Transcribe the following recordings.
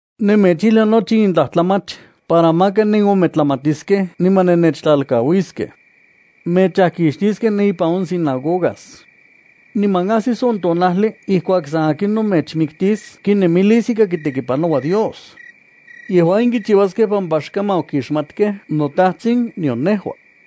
’Nemechijlia nochi in tlajtlamach para maka nenometlamatiskej niman nennechtlalkauiskej. Mechajkixtiskej ne ipan on sinagogas. Niman ajsis on tonajli ijkuak san akinon mechmiktis kinemilis ika kitekipanoua Dios. Yejua in kichiuaskej pampa xkaman okixmatkej noTajtsin nion nejua.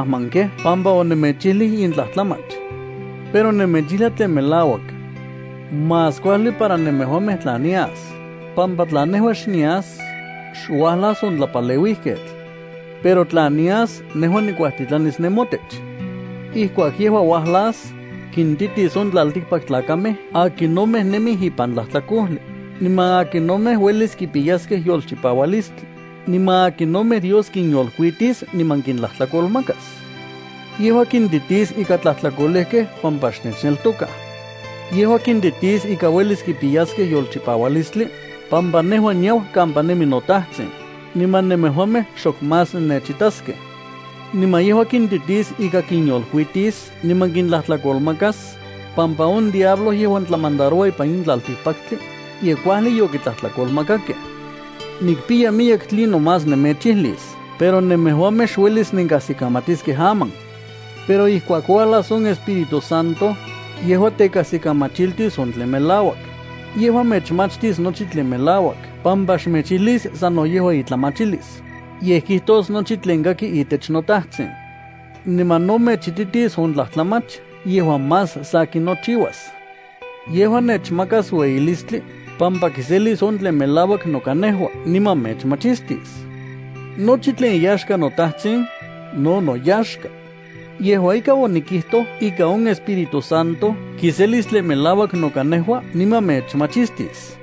Yej sanoyej yonenmajmankej pampa onemechijlij in tlajtlamach. Pero nemechijlia tlen melauak. Más kuajli para nemejuamej tla nias, pampa tla nejua xnias, xuajlas on Tlapaleuijketl. Pero tla nias, nejua nikuajtitlanis nemotech. Ijkuak yejua uajlas, kintitis on tlaltikpaktlakamej akinomej nemij ipan tlajtlakojli, niman akinomej uelis kipiyaskej yolchipaualistli, niman akinomej Dios kinyolkuitis niman kintlajtlakolmakas. Yejua kintitis ika tlajtlakolejkej pampa xnechneltokaj. Yejua kintitis ika uelis kipiyaskej yolchipaualistli, pampa nejua niau kampa nemi noTajtsin, niman nemejuamej xok más nennechitaskej. Niman yejua kintitis ika kinyolkuitis niman kintlajtlakolmakas, pampa on diablo, yejuan tlamandaroua ipan in tlaltikpaktli, ye kuajli yokitlajtlakolmakakej. ’Nikpiya miyek tlinon más nemechijlis, pero nemejuamej xuelis nenkajsikamatiskej aman. Pero ijkuak uajlas on Espíritu Santo, yejuan tekajsikamachiltis on tlen melauak, yejua mechmachtis nochi tlen melauak pampa xmechijlis sano yejua itlamachilis, yej kijtos nochi tlen kaki itech noTajtsin. Niman no mechititis on tlajtlamach yejuan más sakin nochiuas. Yejua nechmakas ueyilistli pampa kiselis on tlen melauak noka nejua niman mechmachistis. Nochi tlen iyaxka noTajtsin, no noyaxka. Yejua ika, onikijtoj ika on Espíritu Santo kiselis tlen melauak noka nejua niman mechmachistis.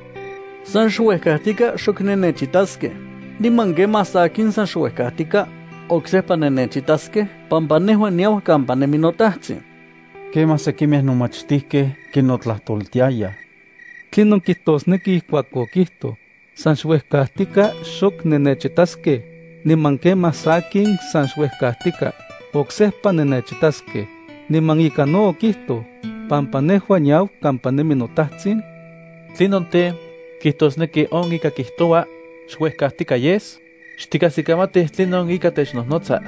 ’San xuejkajtika xok nennechitaskej, niman kemaj sakin san xuejkajtika oksejpa nennechitaskej pampa nejua niau kampa nemi noTajtsin. Kemaj sekimej nomachtijkej kinotlajtoltiayaj: —¿Tlinon kijtosneki ijkuak okijtoj: “San xuejkajtika xok nennechitaskej, niman kemaj sakin san xuejkajtika oksejpa nennechitaskej”, niman ika no okijtoj: “Pampa nejua niau kampa nemi noTajtsin”? ¿Tlinon tej, kijtosneki on ika kijtoua, “xuejkajtika yes”? Xtikajsikamatij tlinon ika technojnotsa.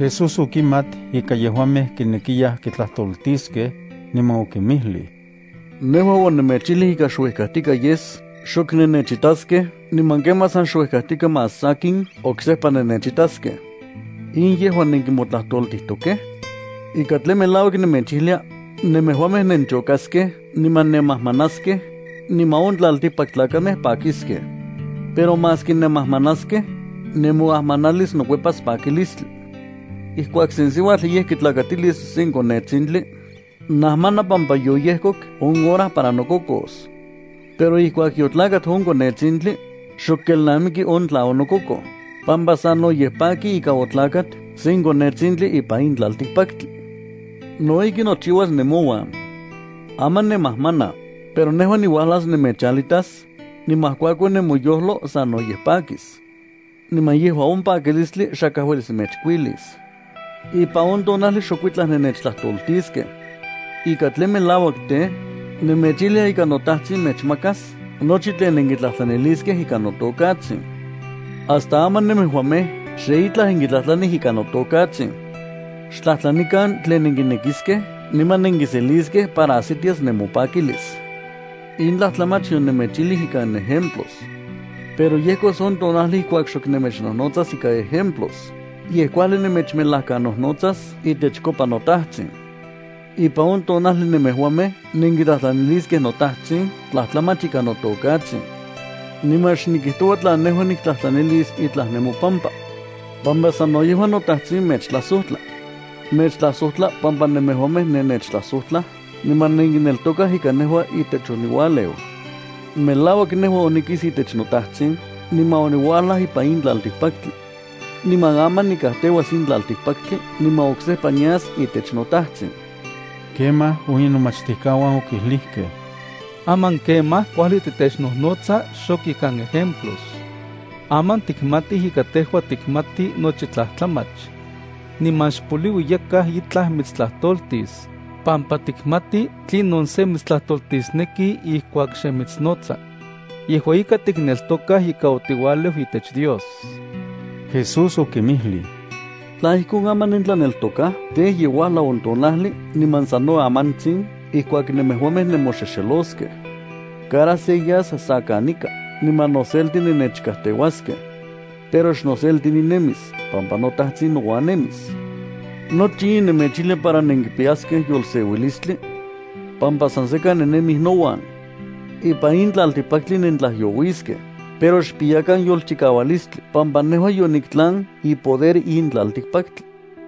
Jesús okimat ika yejuamej kinekiyaj kitlajtoltiskej, niman okinmijlij: —Nejua onemechijlij ika xuejkajtika yes xok nennechitaskej niman kemaj san xuejkajtika más sakin oksejpa nennechitaskej. ¿In yejua nenkimotlajtoltijtokej? Ika tlen melauak nemechijlia, nemejuamej nenchokaskej niman nenmajmanaskej, niman on tlaltikpaktlakamej pakiskej. Pero maski nenmajmanaskej, nemoajmanalis nokuepas pakilistli. Ijkuak sen siuatl ye kitlakatilis sen konetsintli, najmana pampa yoyejkok on hora para nokokos. Pero ijkuak yotlakat on konetsintli, xok kelnamiki on tla onokokoj, pampa sanoyej paki ika otlakat sen konetsintli ipan in tlaltikpaktli. No ijki nochiuas nemouan. Aman nenmajmanaj, pero nejua niuajlas nemechalitas, niman ijkuakon nemoyojlo sanoyej pakis. Niman yejua on pakilistli xakaj uelis mechkuilis. ’Ipan on tonajli xokuitlaj nennechtlajtoltiskej. Ika tlen melauak tej, nemechijlia ika noTajtsin mechmakas nochi tlen nenkitlajtlaniliskej ikan notokatsin. Hasta aman nemejuamej xe itlaj nenkitlajtlanij ikan notokatsin. Xtlajtlanikan tlen nenkinekiskej niman nenkiseliskej para ajsitias nemopakilis. ’In tlajtlamach yonemechijlij ikan ejemplos. Pero yejkos on tonajli ijkuak xok nemechnojnotsas ikan ejemplos, yej kuajli nemechmejlakanojnotsas itechkopa noTajtsin. Ipan on tonajli nemejuamej nenkitlajtlaniliskej noTajtsin tlajtlamach ikan notokatsin. Niman xnikijtoua tla nejua niktlajtlanilis itlaj nemopampa, pampa sano yejua toTajtsin mechtlajsojtla. Mechtlajsojtla pampa nemejuamej nennechtlajsojtlaj niman nenkineltokaj ika nejua itech oniualeu. Melauak nejua onikis itech noTajtsin niman oniuajlaj ipan in tlaltikpaktli. Niman aman nikajteuas in tlaltikpaktli niman oksejpa nias itech noTajtsin. Kemaj on inomachtijkauan okijlijkej: —Aman kemaj kuajli titechnojnotsa xok ikan ejemplos. Aman tikmatij ika tejua tikmati nochi tlajtlamach. Niman xpoliui yakaj itlaj mitstlajtoltis, pampa tikmati tlinon sen mitstlajtoltisneki ijkuak xe mitsnotsa. Yejua ika tikneltokaj ika otiualeu itech Dios. Jesús okinmijlij: —¿Tla ijkon, aman nentlaneltokaj? Tej, ye uajlau on tonajli niman sano amantsin ijkuak nemejuamej nemoxexeloskej. Cada se yas sa kanika niman noselti nennechkauaskej. Pero xnoselti ninemis pampa noTajtsin nouan nemis. Nochi in nemechijlia para nenkipiyaskej yolseuilistli, pampa san sekan nennemij nouan. Ipan in tlaltikpaktli nentlajyouiskej, pero xpiyakan yolchikaualistli pampa nejua yoniktlan ipoder in tlaltikpaktli.